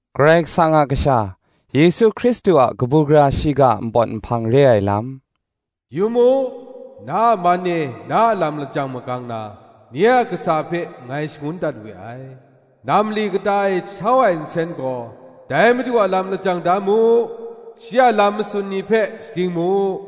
Karai Kasang a Kasha, Yesu Hkristu a kabu gara shiga a npawt nhpang re ai lam. “Yu mu, na a man e na a lam lajang magang na, Nye a kasa hpe ngai shangun dat we ai; ‘Nam mali kata e jahtau ai nsen gaw': Dai madu a lam lajang da mu, Shi a lam masun ni hpe shading mu”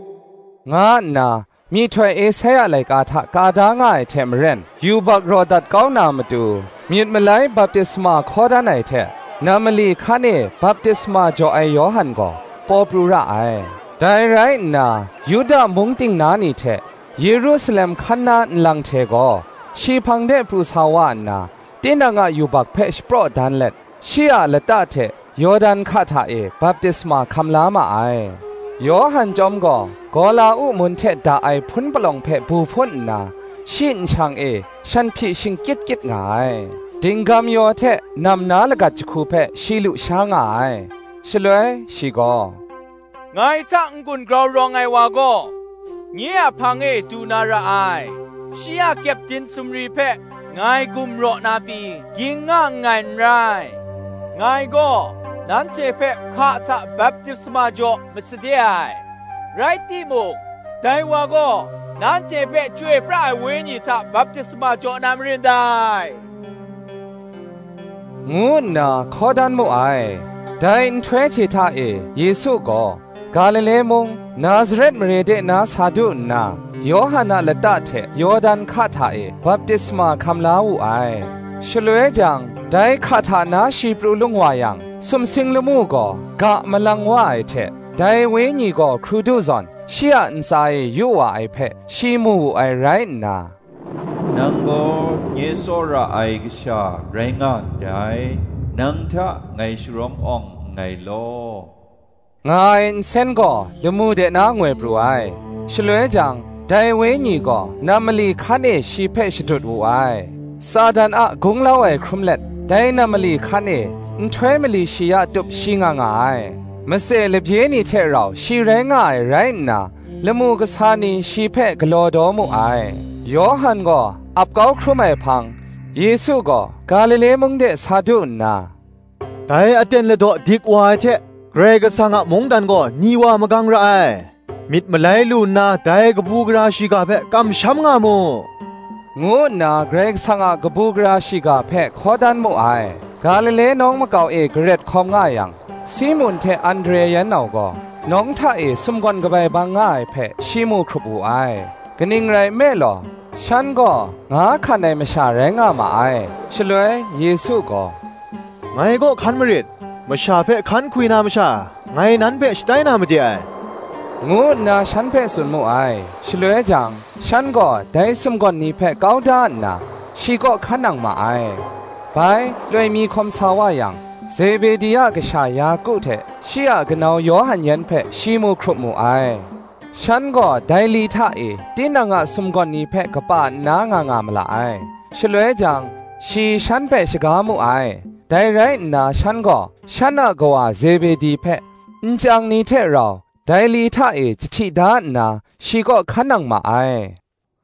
nga nna, myihtoi Esaia laika hta ka da nga ai hte maren, yubak raw dat kau na matu, myit malai baptisma hkaw dan ai hte, nam mali hkan e baptisma jaw ai Yawhan gaw, paw pru ra ai. Dai rai nna, Yuda mung ting na ni hte, Yerusalem hkan na nlang hte gaw, shi hpang de pru sa wa nna, tinang a yubak hpe shapraw dan let, shi a lata hte Yawdan hka hta e baptisma hkam la ma ai. Yawhan chyawm gaw, gawla-uk mun hte da ai hpun palawng hpe bu hpun nna, shi nshang e shanhpyi shingkyit kyit nga ai: dinggam-yaw hte nam na lagat jahku hpe shi lu sha nga ai. Shaloi shi gaw, “Ngai hta n-gun grau rawng ai wa gaw, nye a hpang e du na ra ai: shi a kyepdin sumri hpe ngai gum raw na pyi ging nga nngai n rai. Ngai gaw nanhte hpe hka hta baptisma jaw masade ai, rai timung, dai wa gaw, nanhte hpe chyoi pra ai Wenyi hta baptisma jaw na marin dai,” ngu nna hkaw dan mu ai. Dai nhtoi hte hta e Yesu gaw, Galile mung, Nazaret mare de na sa du nna Yawhan a lata hte Yawdan hka hta e baptisma hkam la wu ai. Shaloi jang, dai hka hta na shi pru lung wa yang sumsing lamu gaw ga malang wa ai hte, dai Wenyi gaw hkrudu zawn, shi a ntsa e yu wa ai hpe, shi mu wu ai rai nna, Nang gaw nye tsawra ai Kasha rai nga ndai; nang hta ngai sharawng awng nngai law,” nga ai nsen gaw lamu de na ngoi pru ai. Shaloi jang, dai Wenyi gaw nam mali hkan e shi hpe shadut wu ai. Satan a gunglau ai hkrum let, dai nam mali hkan e, nhtoi mali shi ya tup shi nga nga ai; matse labye ni hte rau shi rai nga ai rai nna, lamu kasa ni shi hpe galaw daw mu ai. Yawhan gaw ap kau hkrum ai hpang, Yesu gaw Galile mung de sa du nna, “Dai aten ladaw dik wa ai hte, Karai Kasang a mungdan gaw ni wa magang ra ai: myit malai lu nna, dai kabu gara shiga hpe kamsham nga mu,” ngu nna Karai Kasang a kabu gara shiga hpe hkaw dan mu ai. Galile nawng makau e garet hkawm nga yang, Simun hte Andre yan nau gaw nawng hta e sumgawn kabai bang nga ai hpe, shi mu hkrup wu ai: kaning rai nme law, shan gaw nga hkan ai masha rai nga ma ai. Shaloi Yesu gaw, “Ngai kaw hkan marit; masha hpe hkan hkwi na masha, ngai nan hpe shatai na made ai,” ngu nna shan hpe tsun mu ai. Shaloi jang, shan gaw dai sumgawn ni hpe kau da nna, shi kaw hkan nang ma ai. Bai, loi mi hkawm sa wa yang, Zebedi a kasha Yaku hte shi a kanau Yawhan yan hpe shi mu hkrup mu ai; shan gaw dai li hta e, tinang a sumgawn ni hpe kapa nna nga nga mala ai. Shaloi jang, shi shan hpe shaga mu ai: dai rai nna shan gaw, shan a kawa Zebedi hpe, nchyang ni hte rau, dai li hta e jahti da nna shi kaw hkan nang ma ai.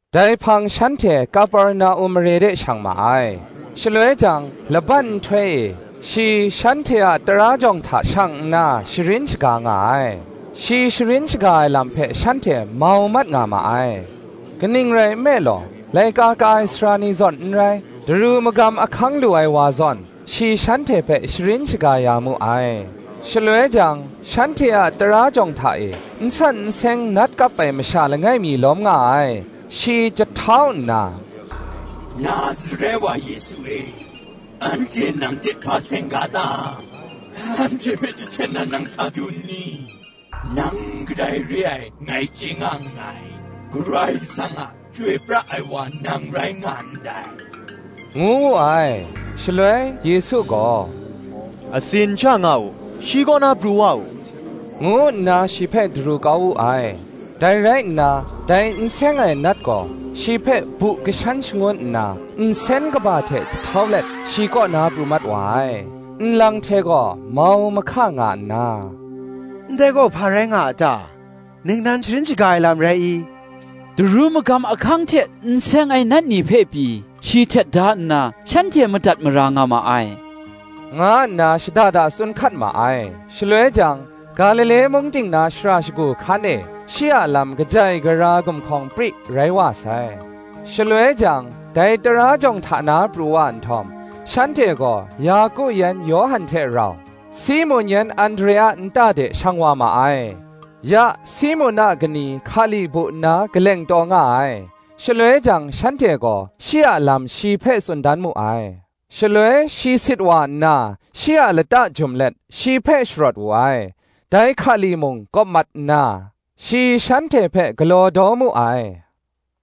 Dai hpang shanhte Kaperna-um mare de shang ma ai. Shaloi jang laban nhtoi e shi shanhte a tara jawng hta shang nna sharin shaga nga ai. Shi sharin shaga ai lam hpe shanhte mau mat nga ma ai: kaning rai nme law, laika ka ai sara ni zawn n rai, daru magam ahkang lu ai wa zawn shi shanhte hpe sharin shaga ya mu ai. Shaloi jang, shanhte a tara jawng hta e, n san n seng nat kap ai masha langai mi lawm nga ai: shi jahtau nna, Nazaret wa Yesu e, anhte nang hte hpa seng ga ta? anhte hpe jahten na nang sa du nni? nang kadai re ai ngai chye nga nngai; Karai Kasang a Chyoi pra ai wa nang rai nga ndai, ngu wu ai. Shaloi Yesu gaw, Atsin sha nga u, shi kaw na pru wa u, ngu nna shi hpe daru kau wu ai. Dai rai nna, dai n seng ai nat gaw shi hpe bu lashan shangun nna, nsen kaba hte jahtau let shi kaw na pru mat wa ai. Nlang hte gaw mau mahka nga nna, Ndai gaw, hpa rai nga a ta? ningnan sharin shaga ai lam rai i? daru magam ahkang hte n seng ai nat ni hpe pyi shi htet da nna, shanhte madat mara nga ma ai, nga nna shada da tsun hkat ma ai. Shaloi jang, Galile mung ting na shara shagu hkan e, shi a lam kajai gara gumhkawng pri rai wa sai. Shaloi jang, dai tara jawng hta na pru wa nhtawm, shanhte gaw Yaku yan Yawhan hte rau, Simun yan Andre a nta de shang wa ma ai. Ya Simun a kani hkali bu nna kaleng taw nga ai: shaloi jang shanhte gaw shi a lam shi hpe tsun dan mu ai. Shaloi shi sit wa nna, shi a lata jum let shi hpe sharawt wu ai. Dai hkali mung kawp mat nna, shi shanhte hpe galaw daw mu ai.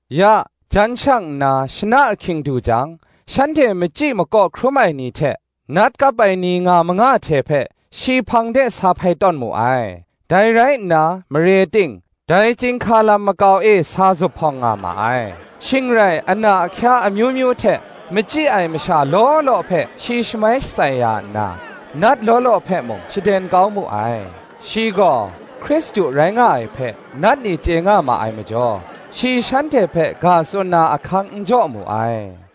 Ya, jan shang nna shana ahkying du jang, shanhte machyi makaw hkrum ai ni hte nat kap ai ni nga manga hte hpe, shi hpang de sa hpai tawn mu ai: dai rai nna, mare ting, dai chyinghka lam makau e sa zuphpawng nga ma ai. Shing rai ana ahkya amyu myu hte machyi ai masha law law hpe shi shamai shatsai ya nna, nat law law hpe mung, shaden kau mu ai; shi gaw Hkristu rai nga ai hpe, nat ni chye nga ma ai majaw, shi shanhte hpe ga tsun na ahkang n jaw mu ai.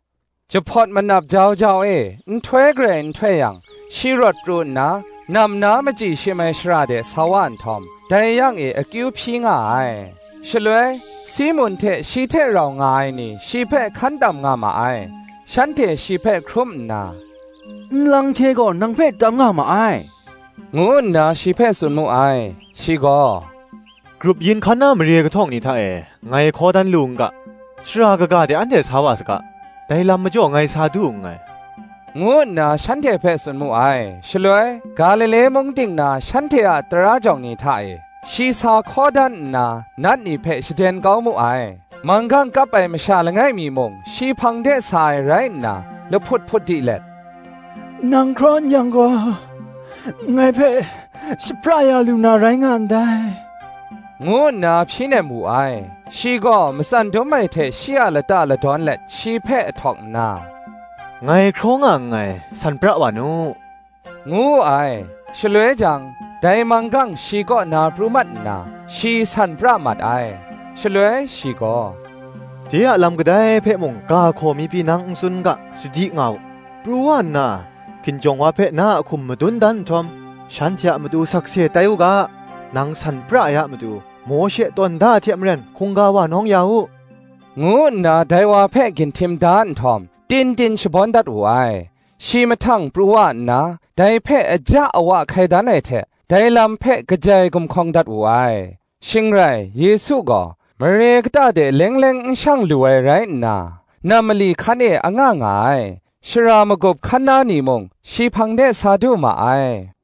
Jahpawt manap jau jau e, nhtoi garai n htoi yang, shi rawt pru nna, nam na machyi shim ai shara de sa wa nhtawm, dai yang e akyu hpyi nga ai. Shaloi Simun hte shi hte rau nga ai ni shi hpe hkan tam nga ma ai: shanhte shi hpe hkrum nna, Nlang hte gaw nang hpe tam nga ma ai, ngu nna shi hpe tsun mu ai. Shi gaw, Grup yin hkan na mare kahtawng ni hta e ngai hkaw dan lu n ga, shara kaga de anhte sa wa saga; dai lam majaw ngai sa du nngai, ngu nna shanhte hpe tsun mu ai. Shaloi, Galile mung ting na shanhte a tara jawng ni hta e, shi sa hkaw dan nna, nat ni hpe shaden kau mu ai. Manggang kap ai masha langai mi mung shi hpang de sa ai rai nna, lahput hput di let, Nang hkraw n-yang gaw, ngai hpe shapra ya lu na rai nga ndai, ngu nna hpyi nem wu ai. Shi gaw matsan dum ai hte shi a lata ladawn let shi hpe ahtawk nna, Ngai hkraw nga nngai, san pra wa nu, ngu wu ai. Shaloi jang, dai manggang shi kaw na pru mat nna, shi san pra mat ai. Shaloi shi gaw, De a lam, kadai hpe mung, ga hkaw mi pyi nang n tsun n ga, sadi nga u: pru wa nna, hkinjawng wa hpe na a hkum madun dan nhtawm, shanhte a matu sakse tai u ga, nang san pra ai a matu, Mawshe tawn da ai hte maren, hkungga wa nawng ya u, ngu nna dai wa hpe ginhtim da nhtawm tin tin shabawn dat wu ai. Shi mahtang pru wa nna, dai hpe aja awa hkai dan ai hte dai lam hpe kajai gumhkawng dat wu ai: shing rai Yesu gaw, mare kata de leng leng n shang lu ai rai nna, nam mali hkan e anga nga ai: shara magup hkan na ni mung, shi hpang de sa du ma ai.